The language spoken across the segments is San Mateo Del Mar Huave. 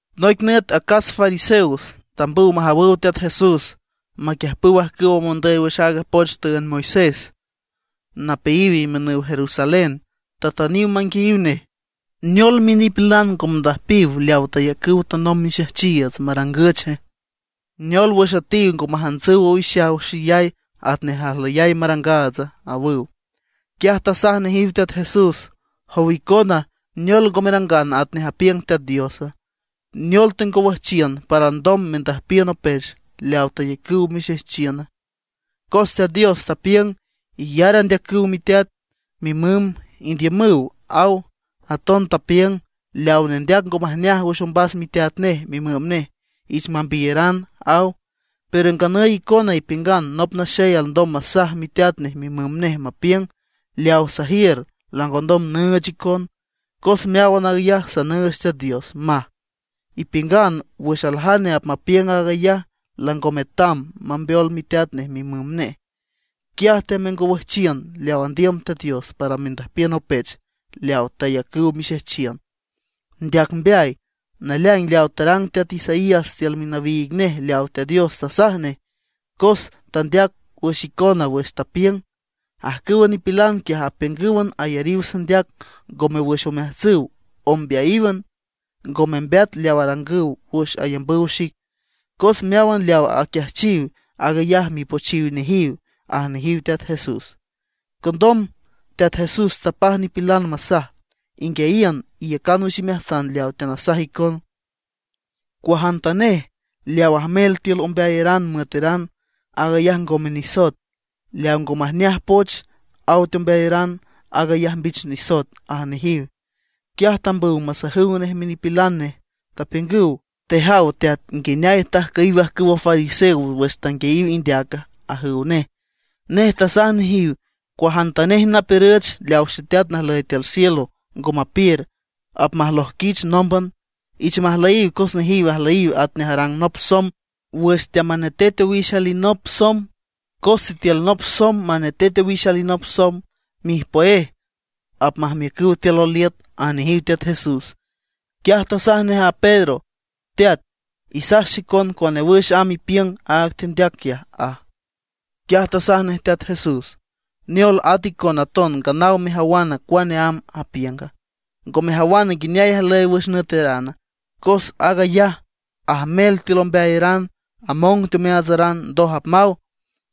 Noic nüt acas fariseos tambüw majawüw Teat Jesús, maquiüjpüw ajcüw mondüy wüx aaga poch tüünd Moisés, napeayiw imiünüw Jerusalén. Tatüniw manguiayiw nej: ―¿Neol minipilan ngo mandüjpiw leaw tayacüw tanomb mixejchiiüts marangüche? ¿Neol wüx üetiw ngo majantsüw owixaw xeyay atnej ajlüyay marangaatsa? ―awüw. Quiaj tasaj nejiw Teat Jesús: ―Jow icona, ¿neol ngo merangan atnej apiüng Teat Diosa? ¿Neol tengowüjchiün para alndom mendüjpiün opech leaw tayacüw mixejchiüna? Cos Teat Dios tapiüng: “Iyar andeacüw miteat, mimüm, indiümüw”, aw. Aton tapiüng: “Leawa nendeac ngo majneaj wüx ombas miteat nej, mimüm nej, ich mambiyaran”, aw. Pero nganüy icona ipiüngan nop naxey alndom masaj miteat nej mimüm nej, mapiüng: “Leawa sajiür langondom nüüch icon, cos meáwan aag ayaj sanüüch Teat Dios”, maj. Ipiüngan wüx aljane apmapiüng aag ayaj, lango metam mambeol miteat nej mimüm nej. Quiaj temengowüjchiün leaw andiüm Teat Dios para mendüjpiün opech leaw tayacüw mixejchiün. ¡Ndeac mbeay! Naleaing leaw tarang teat Isaías tiül minawiig nej leaw Teat Dios tasaj nej, cos tandeac wüx icona wüx tapiüng: Ajcüwa nipilan quiaj apiüngǘwan ayariw sandeac, ngome wüx omeajtsüw, ombeayíwan. Ngo membeat leaw arangüw wüx ayambüw xic, cos meáwan leaw aquiajchiw, aag ayaj mipochiw nejiw ―aj nejiw Teat Jesús. Condom Teat Jesús tapaj nipilan masaj: ―Inguiayiün, iyacan wüx imeajtsan leaw teanasaj icon: Cuajantanej leaw ajmel tiül ombeayaran müeteran, aag ayaj ngome nisoet; leaw ngo majneaj poch aw teombeayaran aag ayaj mbich nisoet ―aj nejiw. Quiaj tambüw masajüw nej minipilan nej, tapiüngüw: ―¿Tejaw Teat, nguineay tajcüyiw ajcüwa fariseos wüx tanguiayiw indeaca? ―ajüw nej. Nej tasaj nejiw: ―Cuajantanej napiürüch leaw Xeteat najlüy tiül cielo ngo mapiür, apmalojquich nómban. Ich majlüyiw cos nejiw ajlüyiw atnej arang nop somb wüx teamanetet owix alinop somb. Cos sitiül nop somb apmanetet owix alinop somb, mijpüéj apmajmiücüw tiül loliüt ―aj nejiw Teat Jesús. Quiaj tasaj nej a Pedro: ―Teat, isaj xicon cuane wüx amb apiüng aaga tendeac quiaj ―aj. Quiaj tasaj nej Teat Jesús: ―¿Neol, at a icona aton nganaw mejawana cuane amb apiünga? ¿Ngo mejawan nguineay ajlüy wüx nüeterana? Cos aag ayaj ajmel tiül ombeayaran, among teomeaatsaran, ndoj apmaw.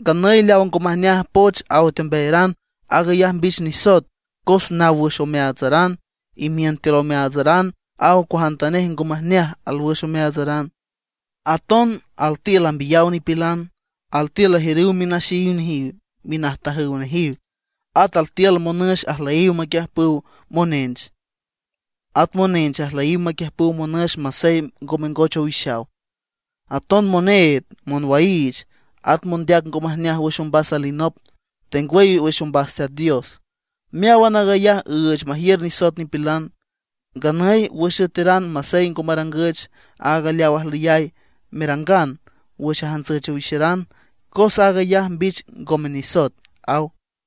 Nganüy leaw ngo majneaj poch aw teombeayaran, aag ayaj mbich nisoet cos naw wüx omeaatsaran. Imiün tiül omeaatsaran aw cuajantanej ngo majneaj alwüx omeaatsaran. Aton altiül ambiyaw nipilan. Altiül ajiürüw minaxeyiw nejiw, minajtajüw nejiw, at altiül monüx ajlüyiw maquiüjpüw monench, at monench ajlüyiw maquiüjpüw monüx masey ngo mengoch owixaw. Aton moneed, monwaiich, at mondeac ngo majneaj wüx ombas alinop, tengwüy wüx ombas Teat Dios. Meáwan aag ayaj üüch majiür nisoet nipilan. Nganüy, wüx üeteran masey ngo marangüch aaga leaw ajlüyay merangan wüx ajantsüch owixaran, cos aag ayaj mbich ngome nisoet ―aw.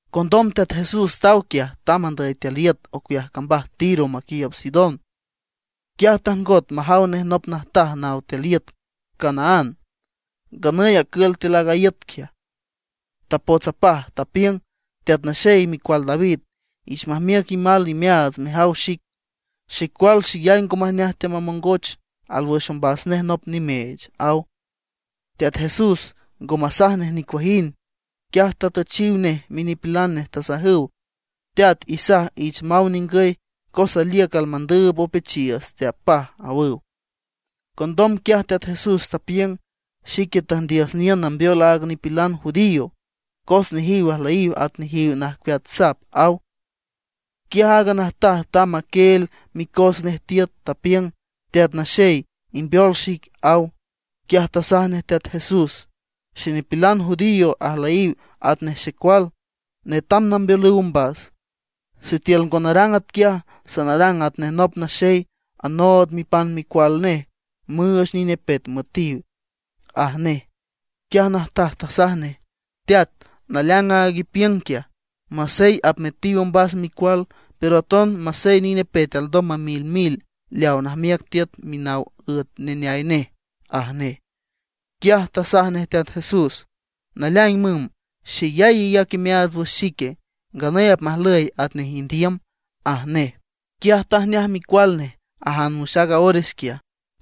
Condom Teat Jesús taw quiaj, tamb andüy tiül iüt ocueaj cambaj Tiro maquiiüb Sidón. Quiaj tajngot majaw nej nop najtaj naw tiül iüt Canaán, nganüy acül tiül aaga iüt quiaj. Tapots apaj, tapiüng: ―¡Teat Naxey, micual David, ich majmiüc imal imeaats mejaw xic! Xecual xeyay ngo majneaj teamamongoch, alwüx ombas nej nop nimeech ―aw. Teat Jesús ngo masaj nej nicuajind. Quiaj tatüchiw nej minipilan nej, tasajüw: ―Teat, isaj ich maw ningüy, cos aliüc almandüüb opechiiüts teapaj ―awüw. Condom quiaj Teat Jesús tapiüng: ―Xique tüjndiüs niün nambeol áagan nipilan judío, cos nejiw ajlüyiw at nejiw najcueat sap ―aw. Quiaj aaga najtaj tamb taquieel micos nej tiüt, tapiüng: ―Teat Naxey, imbeol xic ―aw. Quiaj tasaj nej Teat Jesús: ―Xenipilan judío ajlüyiw atnej xecual, netam nambeolüw ombas. Sitiül ngo narang atquiaj, sanarang atnej nop naxey anood mipan micual nej müüch nine pet müetiw ―aj nej. Aaga najtaj tasaj nej: ―Teat, naleaing aag ipiüng quiaj, masey apmetiw ombas micual, pero aton masey nine pet alndom mamilmil leaw najmiüc tiüt minaw üet neneay nej ―aj nej. Quiaj tasaj nej Teat Jesús: ―¡Naleaing müm, xeyay iyac imeaats wüx xique! Nganüy apmajlüy atnej indiüm ―aj nej. Quiaj tajneaj micual nej ajan wüx aaga ores quiaj.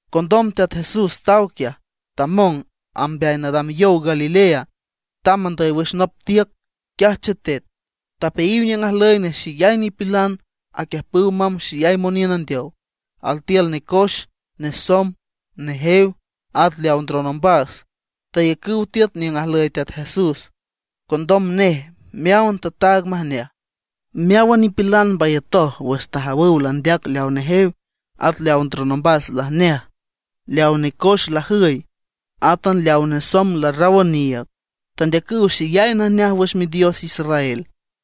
Condom Teat Jesús taw quiaj, tamong amb mbeay nadam yow Galilea, tamb andüy wüx nop tiüc, quiaj chetet. Tapeayiw niüng ajlüy nej xeyay nipilan, aquiüjpüw mamb xeyay moniün andeow; altiül necoex, nesomb, nejew, at leaw ndron ombas. Tayacüw tiüt niüng ajlüy Teat Jesús, condom nej meáwan tataag majneaj. Meáwan nipilan mbayatoj wüx tajawüw landeac leaw nejew, at leaw ndron ombas lajneaj, leaw necoex lajüy, átan leaw nesomb larraw oniiüg. Tandeacüw xeyay najneaj wüx Midios Israel.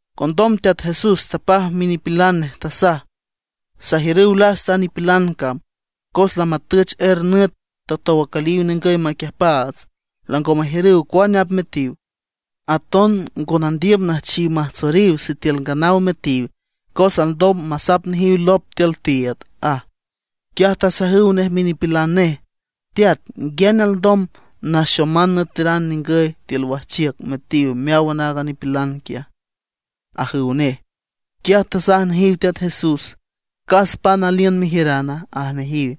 Condom Teat Jesús tapaj minipilan nej, tasaj: ―Sajiürüw lasta a nipilan cam, cos lamatüch er nüt tatow acüliw ningüy maquiüjpaats, lango majiürüw cuane apmetiw. Aton ngo nandiüm nüjchiw majtsoriw sitiül nganaw metiw, cos alndom masap nejiw lop tiül tiiüd ―aj. Quiaj tasajüw nej minipilan nej: ―¿Teat, nguiane alndom naxoman nüeteran ningüy tiül wajchiüc metiw meáwan aaga nipilan quiaja? ―ajüw nej. Quiaj tasaj nejiw Teat Jesús: ―¿Cas pan aliün mejiürana? ―aj nejiw.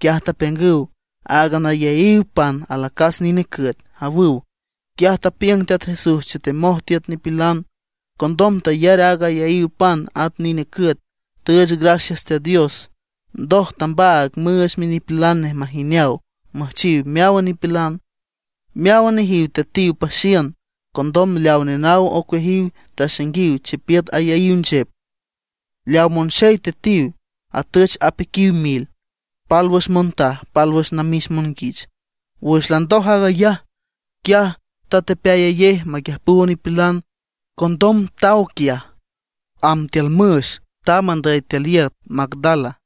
Quiaj tapiüngüw: ―Áagan ayaíw pan alacas nine cüet ―awüw. Quiaj tapiüng Teat Jesús chetemoj tiüt nipilan. Condom tayar aaga ayaíw pan at a nine cüet; tüüch gracias Teat Dios. Ndoj tambaag müüch minipilan nej majineaw müjchiw meáwan nipilan. Meáwan nejiw tetiw paxiün. Condom leaw nenaw ocueajiw taxainguiw chipiüt ayaíw nchep. Leaw monxey tetiw, atüch apiquiw mil, pálwüx montaj, pálwüx namix monguich. Wüx landoj aag ayaj, quiaj tetepeayayej maquiüjpüw nipilan, condom taw quiaj, amb tiül müx. Tamb andüy tiül iüt Magdala.